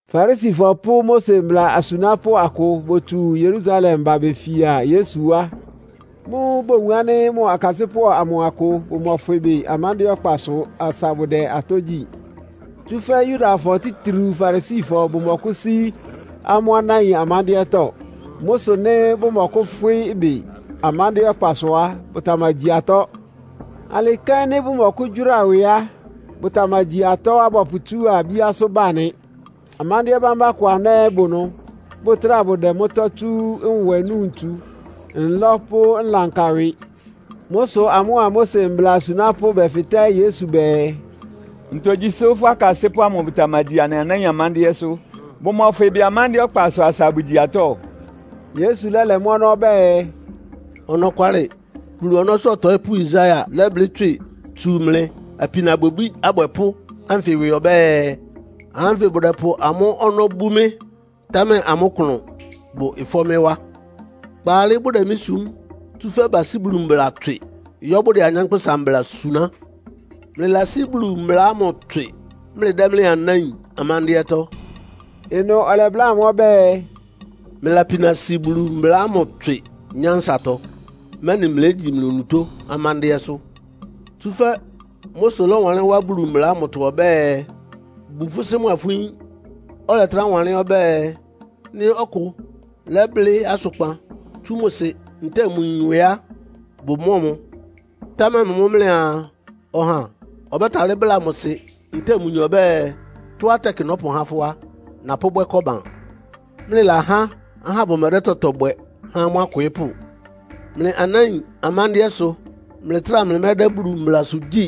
Farisifɔ pʋ́ Mose mbla asunápʋ́ akʋ botsu Yerusalem ba befia Yesu wá. Mʋ́ʋ́ bowun ánɩ́ mʋ akasɩ́pʋ́ amʋ akʋ bʋmɔfwɩ ɩbɩ amándɩ́ɛ́ ɔkpasʋ asa bʋdɛ atɔ́ gyí. (Tsúfɛ́ Yudafɔ, títriu Farisifɔ bʋmɔkʋ́sí amʋ́ anáin amándɩ́ɛ́tɔ́. Mʋ́ sʋ nɩ́ bʋmɔkʋ́fwɩ́ ɩbɩ amándɩ́ɛ́ ɔkpasʋ á, bʋtamagyi atɔ́. Alɩ kɛ́n nɩ́ bʋmɔkʋ́gyʋ́ra ɩwɩ á, bʋtamagyi tɔ́á bɔpʋtsúa bíásʋ́ ba nɩ. Amándɩ́ɛ́ bámbá kʋ aná ɛ́ bʋ ɩnʋ, bʋtráa bʋdɛ mʋ́tɔ́ tsú nwɛ núu ntsu, nlɔ́ pʋ́ nlanka ɩwɩ.) Mʋ́ sʋ amʋ́a Mose mbla asunápʋ́ bɛfɩtɛ́ Yesu bɛɛ, “Ntogyi sʋ́ fʋ́ akasɩ́pʋ́ amʋ bʋtamagyi anɩ anáin amándɩ́ɛ́sʋ́, bʋmɔfwɩ ɩbɩ amándɩ́ɛ́ ɔkpasʋ asa abʋgyi atɔ́?” Yesu lɛ́lɛ mʋ́ ɔnɔ́ ɔbɛ́ɛ, “Ɔnɔkwalɩ Bulu ɔnɔ́sʋ́ ɔtɔɩ́pʋ́Yesaia lɛ́blɩ́ tswɩ tsú mlɩ apinabwɛbí abwɛpʋ́ ánfɩ ɩwɩ ɔbɛ́ɛ, ‘Ahá ánfɩ bʋdɛpʋ amʋ́ ɔnɔ́ bú mɩ́, támɛ amʋ́ klʋn bʋ ɩfɔ́ mɩ́ wá. Kpaalɩ bʋdɛ mɩ́ sum, tsúfɛ́ basí Bulu mbla tswɩ, yɔ́ bʋdɛ anyánkpʋ́sa mbla suná.’ “Mlɩlasí Bulu mbla ámʋ tswɩ, mlɩdɛ́ mlɩ anáin amándɩ́ɛ́tɔ́.” Ɩnʋ ɔlɛbláa amʋ́ ɔbɛ́ɛ, “Mlɩlapina si Bulu mbla ámʋ tswɩ nyánsatɔ, mɛ́nɩ mlégyi mlɩ onutó amándɩ́ɛ́sʋ́. Tsúfɛ́ Mose lɔ́wanlɩ́n wá Bulu mbla ámʋtɔ ɔbɛ́ɛ, ‘Bu fʋ́ sɩ́ mʋa fʋ́ yin.’ Ɔlɛtrá wanlɩ́n ɔbɛ́ɛ, ‘Nɩ́ ɔkʋ lɛ́blɩ́ asʋkpan tsú mʋ sɩ ntɛ́ɛ mʋ yin ɩwɩ á, bʋmɔ́ɔ mʋ.’ Támɛ mlɩ mʋ́ mlɩaa, ɔha ɔbɛ́talɩ́ bláa mʋ sɩ ntɛ́ɛ mʋ yin ɔbɛ́ɛ, ‘Tɔ́á tɛkɩ nɔ́pʋhá fʋ́ á, napʋ́bwɛ́ Koban.’ Mlɩlahá ahá bʋmɛdɛ́ tɔtɔ bwɛ há amʋ́ akwɩɩ́pʋ́. Mlɩ anáin amándɩ́ɛ́ sʋ mlɩtráa mlɩmɛ́dɛ́ Bulu mblasʋ gyí.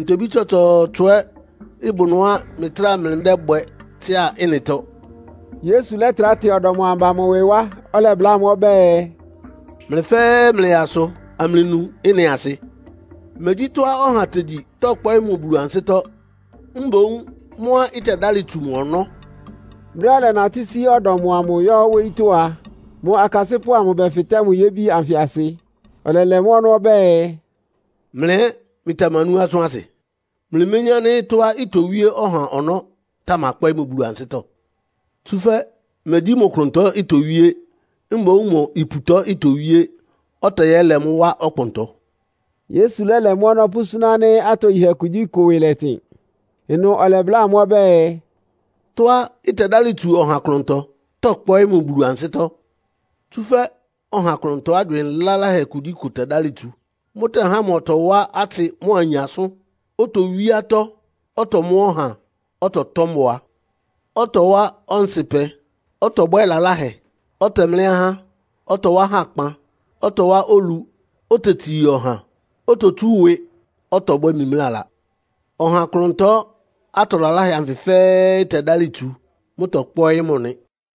Ntobí tsɔtsɔɔtsɔ ɛ́ bʋ ɩnʋá mlɩtráa mlɩdɛ́bwɛ tsɩ́a ɩ́nɩtɔ.” Yesu lɛ́trá tɩ ɔdɔm amʋ ba mʋ ɩwɩ wá, ɔlɛbláa amʋ́ ɔbɛ́ɛ, “Mlɩ fɛ́ɛ́ mlɩyaa asʋ amlɩnu ɩ́nɩ asɩ! Megyí tɔ́á ɔha tegyi tɔ́kpɔ́ɩ́ mʋ Bulu ansɩ́tɔ́. Mboún mʋ́á ɩtɛdálɩ tsu mʋ ɔnɔ́.” Brɛ́á ɔlɛnatɩ́ sí ɔdɔm amʋ yɔ́ wóyítɔ́ a, mʋ akasɩ́pʋ́ amʋ bɛfɩ́tɛ́ mʋ yébi anfɩ asɩ. Ɔlɛlɛ mʋ́ ɔnɔ́ ɔbɛ́ɛ, “Mlɩ ɛ́ mlɩtamanú asʋ́n asɩ? Mlɩméyín ánɩ́ tɔ́á itowíé ɔha ɔnɔ́ tamakpɔ́ɩ́ mʋ Bulu ansɩ́tɔ́? Tsúfɛ́ megyí mʋ klʋntɔ itowíé, mboún mʋ iputɔ itowíé, ɔtɛyɛ́lɛ mʋ́ wá ɔkpʋntɔ.” (Yesu lɛ́lɛ mʋ́tɔ́ pʋ́súná ánɩ́ atogyihɛ kugyíkʋ ɩwɩ lɛtɩn.) Ɩnʋ ɔlɛbláa amʋ́ ɔbɛ́ɛ, “Tɔ́á ɩtɛdálɩ tsu ɔha klʋntɔ tɔ́kpɔ́ɩ́ mʋ Bulu ansɩ́tɔ́. Tsúfɛ́ ɔha klʋntɔ ágywɩɩn laláhɛ kugyíkʋ tɛdálɩ tsu. Mʋ́tɛhá mʋ ɔtɔwá atsɩ mʋ́a ayin asʋ́n, otowí atɔ́, ɔtɔmɔ́ ɔha, ɔtɔtɔ́ mbʋa, ɔtɔwá ɔnsɩpɛ, ɔtɔbwɛ́ lalahɛ, ɔtɛmlɛ́ ahá, ɔtɔwá hakpan, ɔtɔwá olu, otetsii ɔha, ototsú ɩwɩ, ɔtɔbwɛ́ mimlála. Ɔha klʋntɔ, atɔ laláhɛ anfɩ fɛ́ɛ́ ɩtɛdálɩ tsu. Mʋ́tɔ́kpɔ́ɩ́ mʋ nɩ.”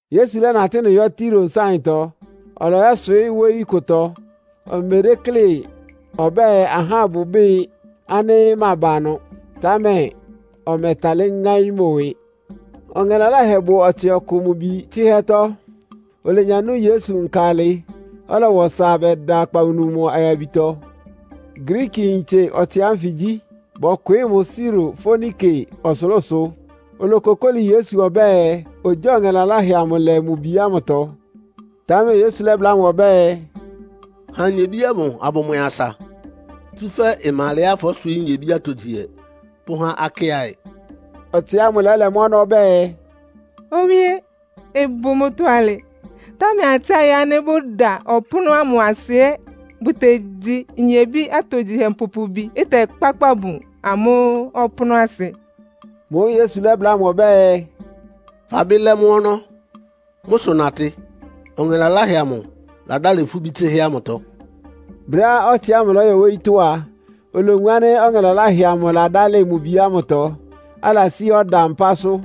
Yesu lɛ́natɩ́ ɩnʋ yɔ́ Tiro nsáɩntɔ. Ɔlɔyɔ́swɩɩ́ wóyí kʋtɔ. Omedéklé ɔbɛ́ɛ ahá bʋbɩ́ɩ ánɩ́ maba ɩnʋ, támɛ ɔmɛtalɩ́ ŋáín mʋ ɩwɩ. Ɔŋɛ laláhɛ bʋ ɔtsɩ ɔkʋ mʋ bi tsɩ́hɛ́tɔ́. Olenya nú Yesu nka alɩ, ɔlɔwa ɔsa bɛda akpawunu mʋ ayabitɔ. Griikiyintse ɔtsɩ ánfɩ gyí. Bɔkwɩɩ́ mʋ Siro Foenike ɔsʋlʋ́sʋ. Olokokóli Yesu ɔbɛ́ɛ, ogyáa ɔŋɛ laláhɛ amʋ lɛ mʋ bi ámʋtɔ. Támɛ Yesu lɛ́bláa mʋ ɔbɛ́ɛ, “Ha nyebí ámʋ abʋmwɛ asa, tsúfɛ́ ɩma alɛá fɔ́swɩɩ́ nyebí atogyihɛ pʋ́há akɩ́aɩ.” Ɔtsɩ ámʋ lɛ́lɛ mʋ́ ɔnɔ́ ɔbɛ́ɛ, “Owíé, ɩbʋ mʋ́tɔ́ alɩ, támɛ akɩ́aɩ ánɩ́ bʋda ɔpʋ́nʋ́ ámʋ asɩ ɛ́ bʋtegyi nyebí atogyihɛ mpupubiá ɩtɛkpákpa bun amʋ́ ɔpʋ́nʋ́asɩ.” Mʋ́ʋ́ Yesu lɛ́bláa mʋ ɔbɛ́ɛ, “Fabɩ́ lɛ́ mʋ́ ɔnɔ́. Mʋ́ sʋ natɩ, ɔŋɛ laláhɛ amʋ ladálɩ fʋ́ bí tsɩ́hɛ́ ámʋtɔ.” Brɛ́á ɔtsɩ ámʋ lɔ́yɔ wóyítɔ́ a, olowun ánɩ́ ɔŋɛ laláhɛ amʋ ladálɩ mʋ bi ámʋtɔ, alasí ɔda mpásʋ́.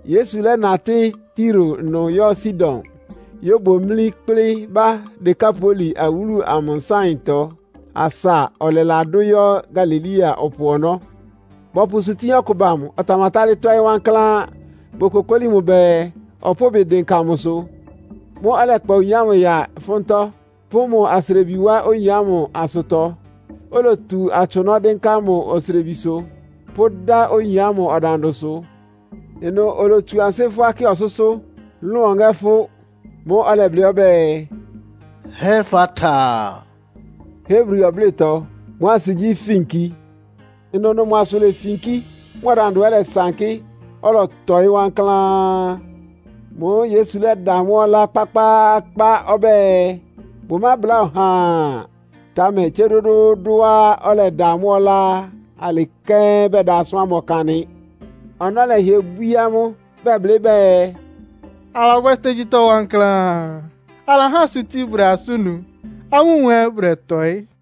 Yesu lɛ́natɩ́ Tiro ɩnʋ yɔ́ Sidon yóbomlí kplɩ́ ba Dekapoli awúlu amʋ nsáɩntɔ asa ɔlɛladʋ́ yɔ́ Galilea ɔpʋ ɔnɔ́. Bɔpʋ ɩsʋtín ɔkʋ ba mʋ, ɔtamatálɩ́ tɔ́ɩ́ wankláán. Bokokóli mʋ bɛɛ, ɔpʋ́ʋ ɩbɩ dɩnka mʋsʋ. Mʋ́ʋ́ ɔlɛkpa oyin ámʋ ya ɩfʋ́ntɔ́, pʋ́ mʋ asrebi wá oyin ámʋ asʋtɔ, olotu atsʋnɔ́ dɩ́nká mʋ osrebisʋ, pʋ́dá oyin ámʋ ɔdandʋsʋ. Ɩnʋ olotsu ansɩ́ fʋ́á kɩ ɔsʋ́sʋ́, lʋ́n ɔŋɛ́ fʋ́. Mʋ́ʋ́ ɔlɛblɩ́ ɔbɛ́ɛ, “Hefata.” Hebri ɔblɩ́tɔ. Mʋ́ asɩ gyí, “Finki.” Ɩnʋnʋ mʋ asʋ lefinkí, mʋ ɔdandʋ ɛ́ lɛsankɩ́, ɔlɔtɔɩ́ wankláán. Mʋ́ʋ́ Yesu lɛ́da ahá ámʋ ɔlá kpákpáákpá ɔbɛ́ɛ, bʋmábláa ɔhaa. Támɛ tsé dʋ́dʋ́ʋ́dʋ́á ɔlɛda amʋ́ ɔlá á, alɩ kɛ́n bɛda asʋ́n ámʋ ɔkan nɩ. Ɔnɔ́ lɛhɩɛ bwíé amʋ́, bɛblɩ́ bɛɛ, “Alabwɛ́ tógyítɔ́ wankláán. Alahá asʋtín bʋdɛ asʋ́n nu, amúmu ɛ́ bʋdɛtɔɩ́.”